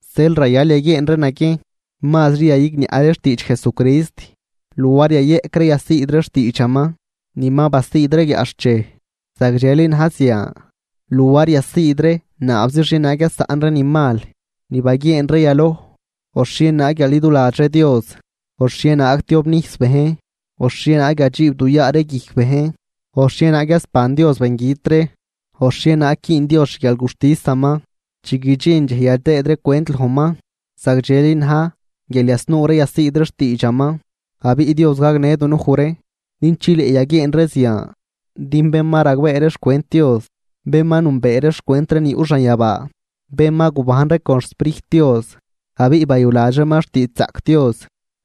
Zeel rayal yaguieen ree naguiejn mazri yayigniaꞌ ree xtiidx Jesucrist, luar yayeꞌc ree yasiid ree xtiidxaman ni ma basiid ree guiaꞌxchej. Zagdxeli na̱j zian luar yasiid ree naabzi xhienaag yasaꞌn ree ni mal ni baguieen ree yaloj, o xhienaag yaliduladx ree Dios, o xhienaag tiobnijs bejn, o xhienaag yadxiib du yaa ree guijc bejn, o xhienaag yasban Dios bengüt ree, o xhienaag güün Dios xguialguxtisaman chi guidxin dxej yadëëd ree cwent lojman, zagdxeli na̱j guial yasnuu ree yasiid ree xtiidxaman. Abiꞌ Dios gagnë dunuj ree din chileꞌ yaguieen ree zian. Din bén ma ragbee ree xcwent Dios, bén ma nünbee ree xcwent ree ni yuꞌ xanyabaa, bén ma gubajn ree con xSprijt Dios, abiꞌ bayuladx reeman xtiidxzaꞌc Dios,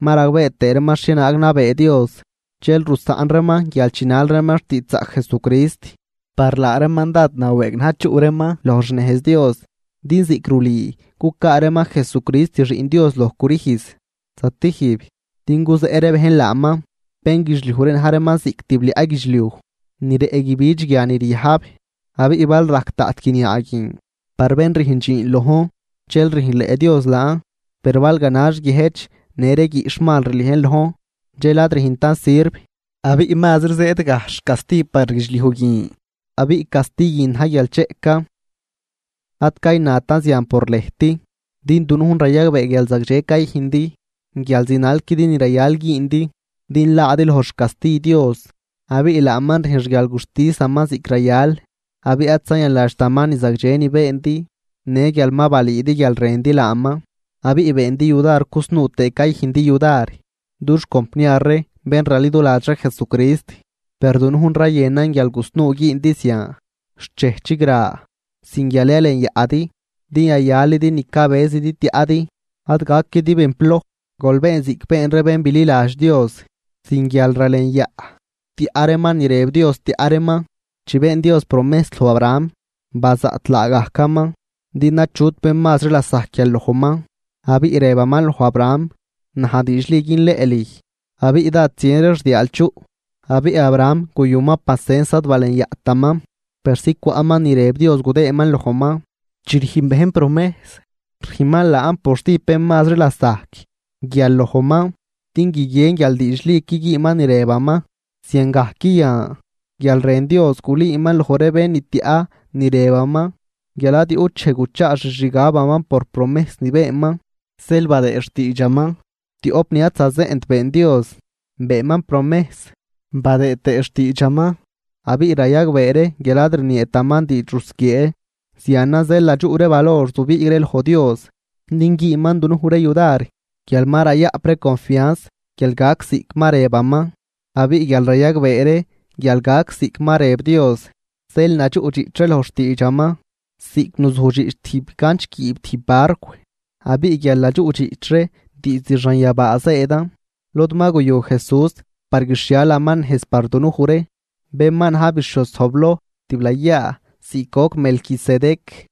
ma ragbee tëë reeman xhienaag nabee Dios, dxel rusaꞌn reeman guial chinal reeman xtiidxzaꞌc Jesucrist, par laa reeman dád nawëëg na̱j chuꞌ reeman loj xnejz Dios, din ziꞌc rulüü cucaa reeman Jesucrist Xiꞌn Dios loj crüjz zatijb din guzeꞌ ree bejn laaman. Bénguidxliuj ree na̱j reeman ziꞌc tibliaꞌ guidxliuj ni rëꞌ guibidx guia ni ryajb, abiꞌ bal rajc daꞌt guiniaa guin par bén rüjn dxiin lojn dxel rüjnleꞌ Dios laan. Per bal ganax guiëjch në ree guiꞌxh mal rliejn lojn, dxel ad rüjntan sirv, abiꞌ mazri zëëd gajxh casti par guidxliuj guin abiꞌ casti guin na̱j guial cheꞌcan. Ad caynatan zian por lëjt, din dunujn rayagbee guial zagdxen cayüjndi, guial zinalquidi ni rayal güündi din laadi loj xcasti Dios. Abiꞌ laaman rüjn xguialguxtisaman ziꞌc rayal, abiꞌ ad zayanladxtaman ni zagdxe ni beendi në guial ma balüüdi guial rëndi laaman, abiꞌ beendi yudar cusnuu tëë cayüjndi yudar dux compniar ree bén raliduladx ree Jesucrist. Per dunujn rayënan guial gusnuu güündi zian xt dxej chigra, sin guial yalenyaꞌdi din yayalidi ni cabëzidi tiaꞌdi. Ad gaquidi bén ploj, gol been ziꞌc been ree bén bililadx Dios sin guialralenyaꞌ tiaꞌ reeman ni rëb Dios tiaꞌ reeman. Chi been Dios promejs loj Abraham, bazaꞌt laagajcaman din achut bén mazri lasajc guial lojman, abiꞌ rëbaman loj Abraham: “Naj diidxli günleꞌ lüj abiꞌ dád zien ree xdiaal chuꞌ.” Abiꞌ Abraham guyuman pacens ad balenyaꞌtaman persi cwaꞌman ni rëb Dios gudëëman lojman. Chi rüjn bejn jurar, rüjnman jurar por stijb bén mazri lasajc guial lojman din guiguien guial diidxliqui güünman ni rëbaman. Ziangajc yan, guial rën Dios gulüüman loj ree bén ni tiaꞌ ni rëbaman guial ad yuꞌt dxej guchaa xixgabaman por promejs ni beenman, zeel beenman jurar. Tioꞌp ni ad zazeꞌnt been Dios, beenman promejs been tëëman jurar abiꞌ rayagbee ree guial ad rnieetaman diidx rusquiee. Zianan zeel nadxuꞌ ree valor zubiig ree loj Dios din güünman dunuj ree yudar guial ma rayaꞌp ree confianz guial gac ziꞌc ma rëbaman. Abiꞌ guial rayagbee ree guial gac ziꞌc ma rëb Dios, zeel nadxuꞌdxiꞌch ree loj xtiidxaman ziꞌc nuzujdxiꞌch tijb ganch guiib tijb barcw. Abiꞌ guial nadxuꞌdxiꞌch ree diizd xanyabaa zëëdan, lod ma guyu Jesús par guixhialaman nejz par dunuj ree, bén ma na̱j bixhioz zojbloj tiblayaa ziꞌc goc Melquisedec.